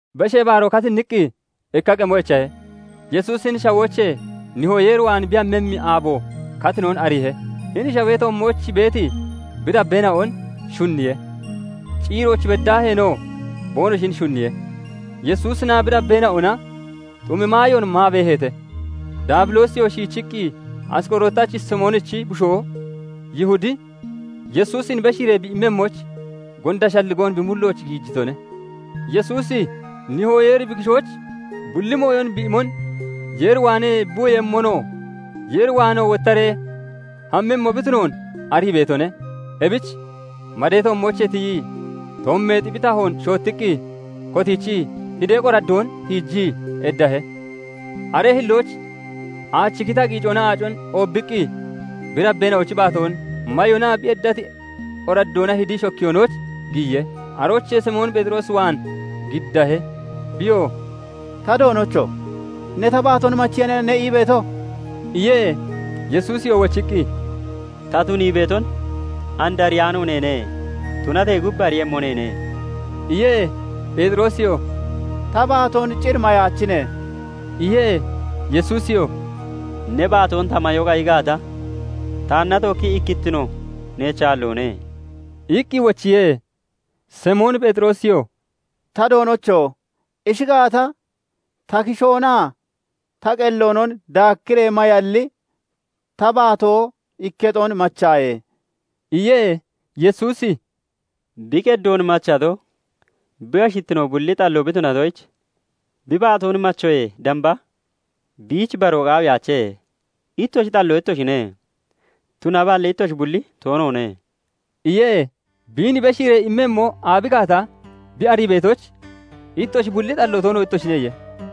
Beshee Baaroo katinniqqi ikka qemo echahe; Yesuusi hini shawoochee Nihoo Yeer waan bi hammemmi aabo katinon ariihe. Hini shawee toommooch beeti bi dabbeena'on shunniye; ciirooch beddaaheenoo boonoshin shunniye. Yesuusinaa bi dabbeena'ona xumi maayoon maa beeheete; Daabiloosiyoo shiichiqqi Asqorootachi Simoonichi bushoo Yihudi Yesuusin beshiiree bi immemmoyich gonda shalligoon bi mullooch giijitone; Yesuusi Nihoo Yeeri bi kishooch bulli mooyon bi imon, Yeer waanee bi womonoo, Yeer waanoo wottaree hammemmo bi tunoon arii beetone. Ebich madee toommoochee tiyii, toommeexi bi tahoon shoottiqqi kotiichii, hidee qoraddoon tiijii eddahe. Aree hillooch aachi kita qiicoona aacon oobbiqqi bi dabbeena'ochi baatoon mayonaa bi eddati qoraddoona hidii shokkiyoonooch giyiye. Aroochee Simoon Pheexiroos waan giddahe; biyoo "Ta Doonocho! Ne ta baatoon machaniya ne ii beeto?" iye. Yesuusiyoo wochiqqi, "Ta tunii beeton and ariyaano neene; tunatee gub ariiyemmo neene" iye. Pheexiroosiyoo "Ta baatoon cir mayaachine!" iye. Yesuusiyoo "Ne baatoon ta mayo qayi gaata, taanna tookkii ikkittino neech aalloone" iqqi wochiye. Simoon Pheexiroosiyoo "Ta Doonocho! Ishi gaata, ta kishoonaa ta qelloonon daakkiree mayalli ta baatoo ikketon machaaye" iye. Yesuusi "Bi qeddoon machato, bi ashittino bulli xalloo bi tunatoyich, bi baatoon machoyee damba biich baroo qaawiyaache. Ittoshi xalloo ittoshine; tunaballi ittoshi bulli toonoone" iye. Biin beshiiree immemmo aabi gaata bi arii beetoyich, "Ittoshi bulli xalloo toono ittoshine" iye.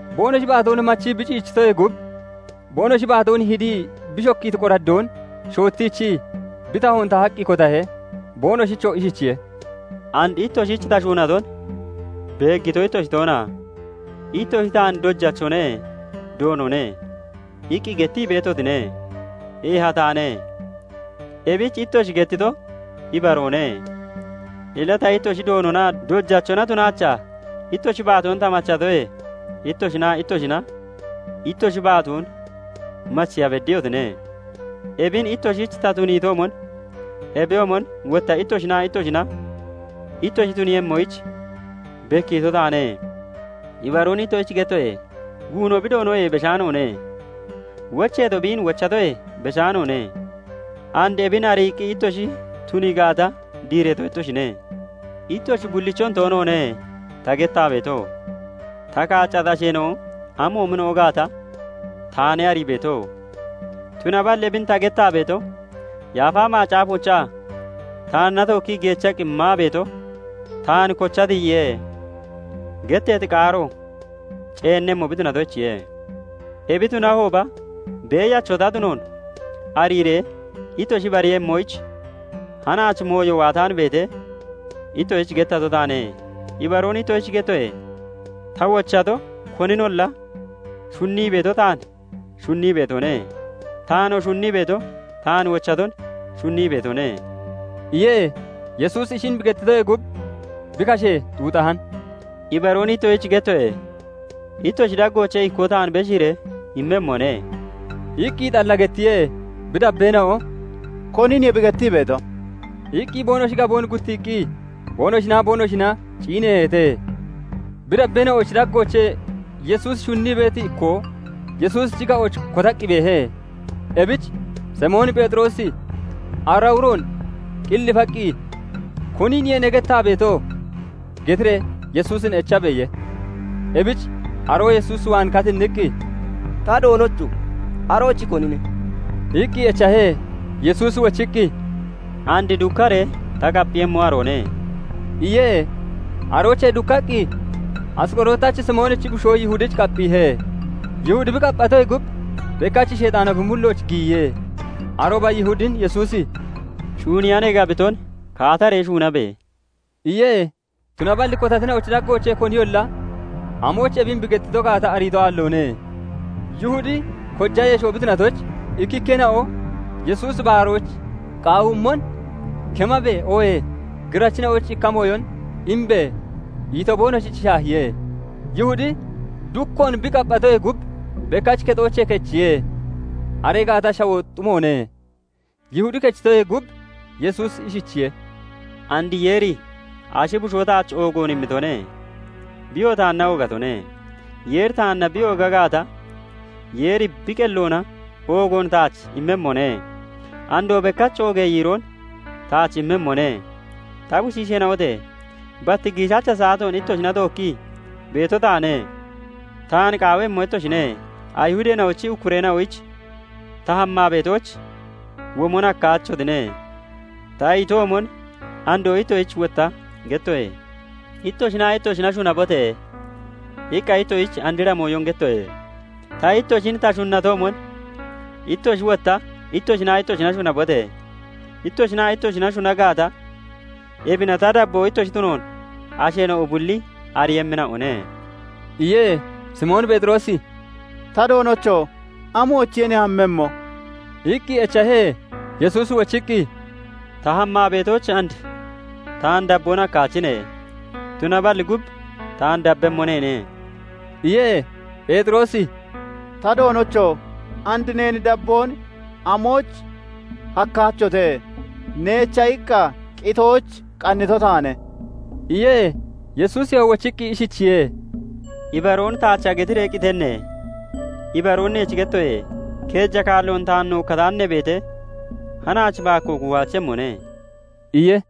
Boonoshi baatoon machii bi ciichitoyee gub boonoshi baatoon hidii bi shokkiiti qoraddoon shoottiichii bi tahoon tahaqqi kotahe; boonoshichoo ishichiye:- "And ittoshich ta shuunaton beeggito ittoshi toona? Ittoshi taan 'Dojachone; Doonone' iqqi gettii beetotine; eeha taane. Ebich ittoshi gettito ibaroone. Illa ta ittoshi Doononaa Dojachona tunaachaa ittoshi baatoon ta machatoye, ittoshinaa ittoshina ittoshi baatoon macheya beddiyotine. Ebin ittoshich ta tuniitoomon ebiyoomon wotta ittoshinaa ittoshina ittoshi tuniiyemmoyich bekkiito taane. Ibaroon ittoshich gettoye:- Guuno bi doonoyee beshaanoone; wocheetoo biin wochatoyee beshaanoone. And ebin ariiqqi ittoshi tunii gaata, diireeto ittoshine. "Ittoshi bullichon toonoone ta gettaa beeto; ta kaaccati asheena'o amoomina'o gaata taane arii beeto. Tunaballi ebin ta gettaa beeto, Yaafa Macaafoochaa 'Taanna tookkii geechaqqi maa beeto taan kocha tiyiye' getteeti qaaro ceennemmo bi tunatoyichiye. Ebi tunahooba Beeyacho ta tunoon ariiree ittoshi ibariiyemmoyich hanaach mooyo waataan beetee, ittoshich gettato taane. Ibaroon ittoshich gettoye:- Ta wochato koninolla shunnii beeto taan shunnii beetone; taanoo shunnii beeto taan wochaton shunnii beetone" iye. Yesuusi ishin bi gettitoyee gub, bi kashe xuuxahan; "Ibaroon ittoshich gettoye:- Ittoshi daggoochee ikkoo taan beshiiree immemmone" iqqi xalla gettiye. Bi dabbeena'o "Koniniye bi gettii beeto?" iqqi boonoshi gaboon guttiiqqi boonoshinaa boonoshina ciineeheete. Bi dabbeena'ochi daggoochee Yesuusi shunnii beeti ikkoo Yesuusichi ga'ooch kotaqqi beehe. Ebich Simoon Pheexiroosi ara uroon qillifaqqi, " 'Koniniye ne gettaa beeto?' getiree Yesuusin echabe!" iye. Ebich aroo Yesuus waan katinniqqi, "Ta Doonocho! Arochi konine?" iqqi echahe. Yesuusi wochiqqi, "And dukkaree ta qapphiiyemmo aroone" iye. Aroochee dukkaqqi Asqorootachi Simoonichi bushoo Yihudich qapphiihe. Yihudi bi qapphatoyee gub bekkach Sheexaano bi mullooch giyiye. Arooba Yihudin Yesuusi "Shuuniya ne gabiton kaataree shuunabe!" iye. Tunaballi kotatina'ochi daggoochee koniyolla amoyich ebin bi gettito gaata ariito aalloone. Yihudi koja yesho bi tunatoyich, ikkikkeena'o Yesuusi "Baaroyich qaawiimmon kemabe!" oohee "Girachina'oyich ikka mooyon imbe!" ito boonoshich shaahiye. Yihudi dukkoon bi qapphatoyee gub bekkach kexoochee kechiye; aree gaata shawoo xumoone. Yihudi kechitoyee gub Yesuusi ishichiye:- "And Yeeri Ashi Bushoo taach oogoon immitone; biyoo taanna oogatone. Yeeri taanna bi ooga gaata, Yeeri bi qelloona oogoon taach immemmone; andoo bekkach oogee yiiroon taach immemmone. "Ta bushiisheena'ote! Bat giishacha saatoon ittoshina tookkii beeto taane. Taan qaawemmo ittoshine; Ayihudeena'ochi ukkureena'oyich 'Ta hammaa beetooch womon hakkaachotine' ta itoomon, andoo ittoshich wotta gettoye. " 'Ittoshinaa ittoshina shunabote!' iqqa ittoshich andra mooyon gettoye; ta ittoshin ta shunnatoomon, ittoshi wotta ittoshinaa ittoshina shunabote! Ittoshinaa ittoshina shuna gaata, ebina ta dabboo ittoshi tunoon asheena'o bulli ariiyemmina'one" iye. Simoon Pheexiroosi "Ta Doonocho! Amoochiye ne hammemmo?" iqqi echahe. Yesuusi wochiqqi, "Ta hammaa beetooch and taan dabboon hakkaachine; tunaballi gub taan dabbemmo neene" iye. Pheexiroosi "Ta Doonocho! And neen dabboon amoyich hakkaachote? Neecha iqqa qitoyich qannito taane" iye. Yesuusiyoo wochiqqi ishichiye:- "Ibaroon taacha getiree qitenne? Ibaroon neech gettoye:- Keeja kaalloon taan nookkataan ne beetee, hanaach baakkoo kuuhaachemmone" iye.